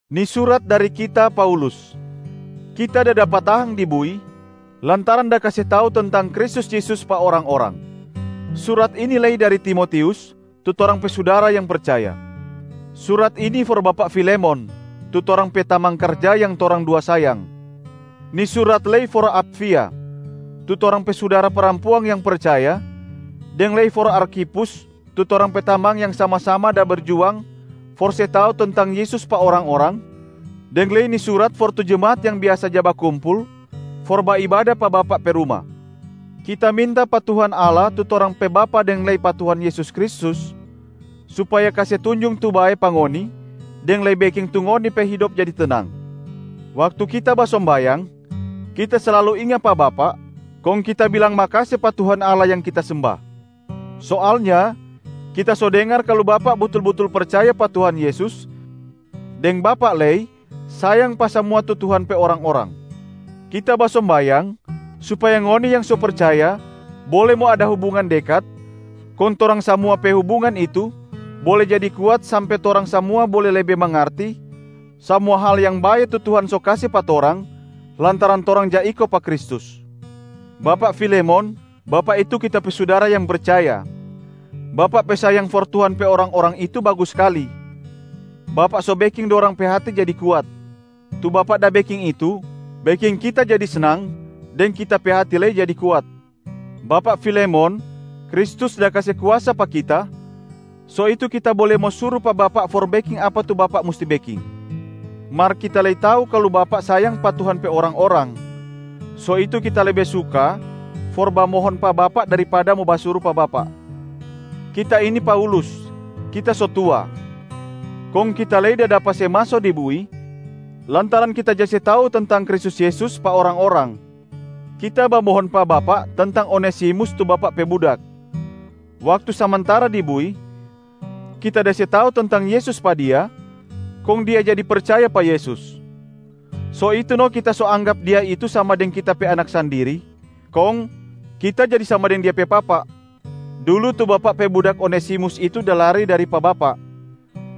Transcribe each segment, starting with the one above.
Ni surat dari kita, Paulus. Kita da dapa tahang di bui lantaran da kase tau tentang Kristus Yesus pa orang-orang. Surat ini lei dari Timotius, tu torang pe sudara yang percaya. Surat ini for bapak Filemon, tu torang pe tamang karja yang torang dua sayang. Ni surat lei for Apfia, tu torang pe sudara parampuang yang percaya deng lei for Arkhipus tu torang pe tamang yang sama-sama da berjuang for se tau tentang Yesus pa orang-orang, deng lei ni surat for tu jemaat yang biasa ja bakumpul for baibada pa bapak pe ruma. Kita minta pa Tuhan Allah tu torang pe Bapa deng lei pa Tuhan Yesus Kristus supaya kase tunjung tu bae pa ngoni deng lei beking tu ngoni pe hidop jadi tenang. Waktu kita basombayang, kita slalu inga pa bapak kong kita bilang makase pa Tuhan Allah yang kita semba. Soalnya kita so dengar kalu bapak butul-butul percaya pa Tuhan Yesus deng bapak lei sayang pa samua tu Tuhan pe orang-orang. Kita basombayang supaya ngoni yang so percaya bole mo ada hubungan dekat, kong torang samua pe hubungan itu bole jadi kuat sampe torang samua bole lebe mangarti samua hal yang bae tu Tuhan so kase pa torang lantaran torang ja iko pa Kristus. Bapak Filemon, bapak itu kita pe sudara yang percaya, bapak pe sayang for Tuhan pe orang-orang itu bagus skali, bapak so beking dorang pe hati jadi kuat. Tu bapak da beking itu beking kita jadi snang deng kita pe hati lei jadi kuat. Bapak Filemon, Kristus da kase kuasa pa kita, so itu kita bole mo suru pa bapak for beking apa tu bapak musti beking, mar kita lei tau kalu bapak sayang pa Tuhan pe orang-orang, so itu kita lebe suka for bamohon pa bapak daripada mo basuru pa bapak. Kita ini Paulus, kita so tua, kong kita lei da dapa se maso di bui lantaran kita ja se tau tentang Kristus Yesus pa orang-orang. Kita bamohon pa bapak tentang Onesimus, tu bapak pe budak. Waktu samantara di bui, kita da se tau tentang Yesus pa dia kong dia jadi percaya pa Yesus. So itu no kita so anggap dia itu sama deng kita pe anak sandiri, kong kita jadi sama deng dia pe papa. Dulu tu bapak pe budak Onesimusa itu da lari dari pa bapak,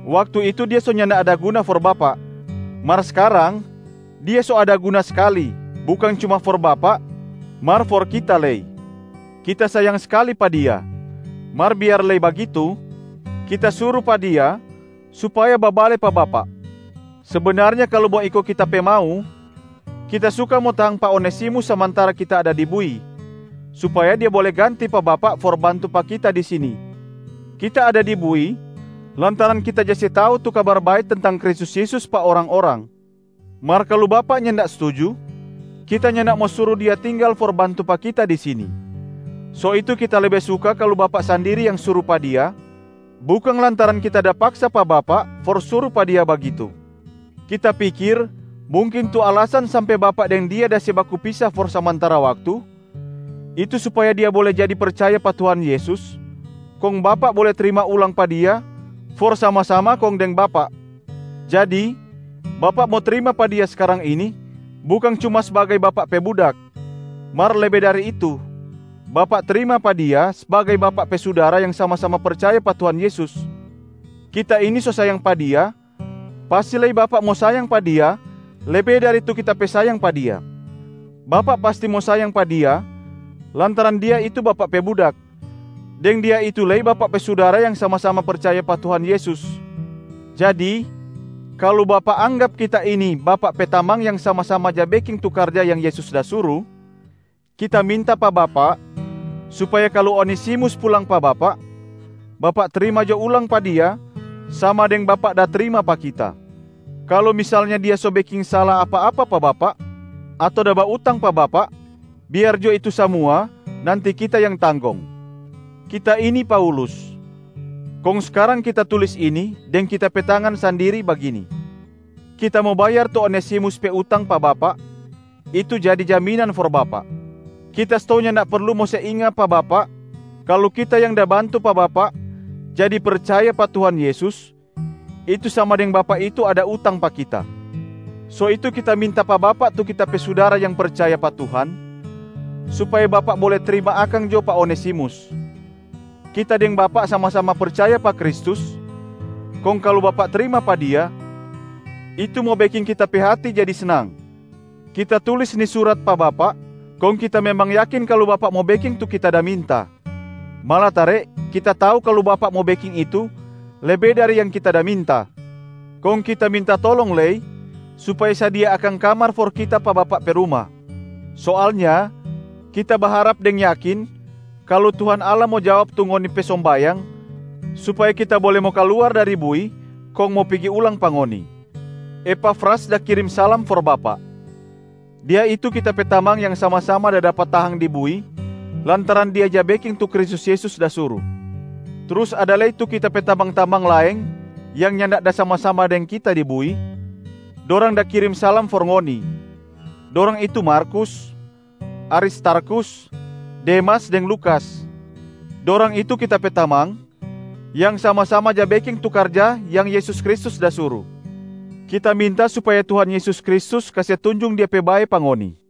waktu itu dia so nyanda ada guna for bapak. Mar skarang dia so ada guna skali, bukang cuma for bapak mar for kita lei. Kita sayang skali pa dia, mar biar lei bagitu, kita suru pa dia supaya babale pa bapak. Sebenarnya kalu mo iko kita pe mau, kita suka mo tahang pa Onesimus samantara kita ada di bui, supaya dia bole ganti pa bapak for bantu pa kita di sini. Kita ada di bui lantaran kita ja se tau tu Kabar Bae tentang Kristus Yesus pa orang-orang. Mar kalu bapak nyanda stuju, kita nyanda mo suru dia tinggal for bantu pa kita di sini, so itu kita lebe suka kalu bapak sandiri yang suru pa dia, bukang lantaran kita da paksa pa bapak for suru pa dia bagitu. Kita pikir mungkin tu alasan sampe bapak deng dia da se baku pisa for samantara waktu, itu supaya dia bole jadi percaya pa Tuhan Yesus, kong bapak bole trima ulang pa dia for sama-sama deng bapak. Jadi bapak mo trima pa dia skarang ini bukang cuma sbagai bapak pe budak, mar lebe dari itu, bapak trima pa dia sbagai bapak pe sudara yang sama-sama percaya pa Tuhan Yesus. Kita ini so sayang pa dia, pasti lei bapak mo sayang pa dia lebe dari tu kita pe sayang pa dia. Bapak pasti mo sayang pa dia lantaran dia itu bapak pe budak, deng dia itu lei bapak pe sudara yang sama-sama percaya pa Tuhan Yesus. Jadi kalu bapak anggap kita ini bapak pe tamang yang sama-sama ja beking tu karja yang Yesus da suru, kita minta pa bapak supaya kalu Onesimus pulang pa bapak, bapak trima jo ulang pa dia sama deng bapak da trima pa kita. Kalu misalnya dia so beking sala apa-apa pa bapak ato da bautang pa bapak, biar jo itu samua nanti kita yang tanggong. Kita ini Paulus, kong skarang kita tulis ini deng kita pe tangan sandiri bagini, “Kita mo bayar tu Onesimus pe utang pa bapak,” itu jadi jaminan for bapak. Kita stou nyanda perlu mo se inga pa bapak kalu kita yang da bantu pa bapak jadi percaya pa Tuhan Yesus, itu sama deng bapak itu ada utang pa kita. So itu kita minta pa bapak tu kita pe sudara yang percaya pa Tuhan supaya bapak bole trima akang jo pa Onesimus. Kita deng bapak sama-sama percaya pa Kristus, kong kalu bapak trima pa dia, itu mo beking kita pe hati jadi snang. Kita tulis ni surat pa bapak kong kita memang yakin kalu bapak mo beking tu kita da minta, malatare kita tau kalu bapak mo beking itu lebe dari yang kita da minta. Kong kita minta tolong lei supaya sadia akang kamar for kita pa bapak pe ruma. Soalnya kita baharap deng yakin kalu Tuhan Allah mo jawab tu ngoni pe sombayang supaya kita bole mo kaluar dari bui kong mo pigi ulang pa ngoni. Epafras da kirim salam for bapak. Dia itu kita pe tamang yang sama-sama da dapa tahang di bui lantaran dia ja beking tu Kristus Yesus da suru. Trus ada lei tu kita pe tamang-tamang laeng yang nyanda da sama-sama deng kita di bui, dorang da kirim salam for ngoni. Dorang itu Markus, Aristarkhus, Demas deng Lukas. Dorang itu kita pe tamang yang sama-sama ja beking tu karja yang Yesus Kristus da suru. Kita minta supaya Tuhan Yesus Kristus kase tunjung Dia pe bae pa ngoni.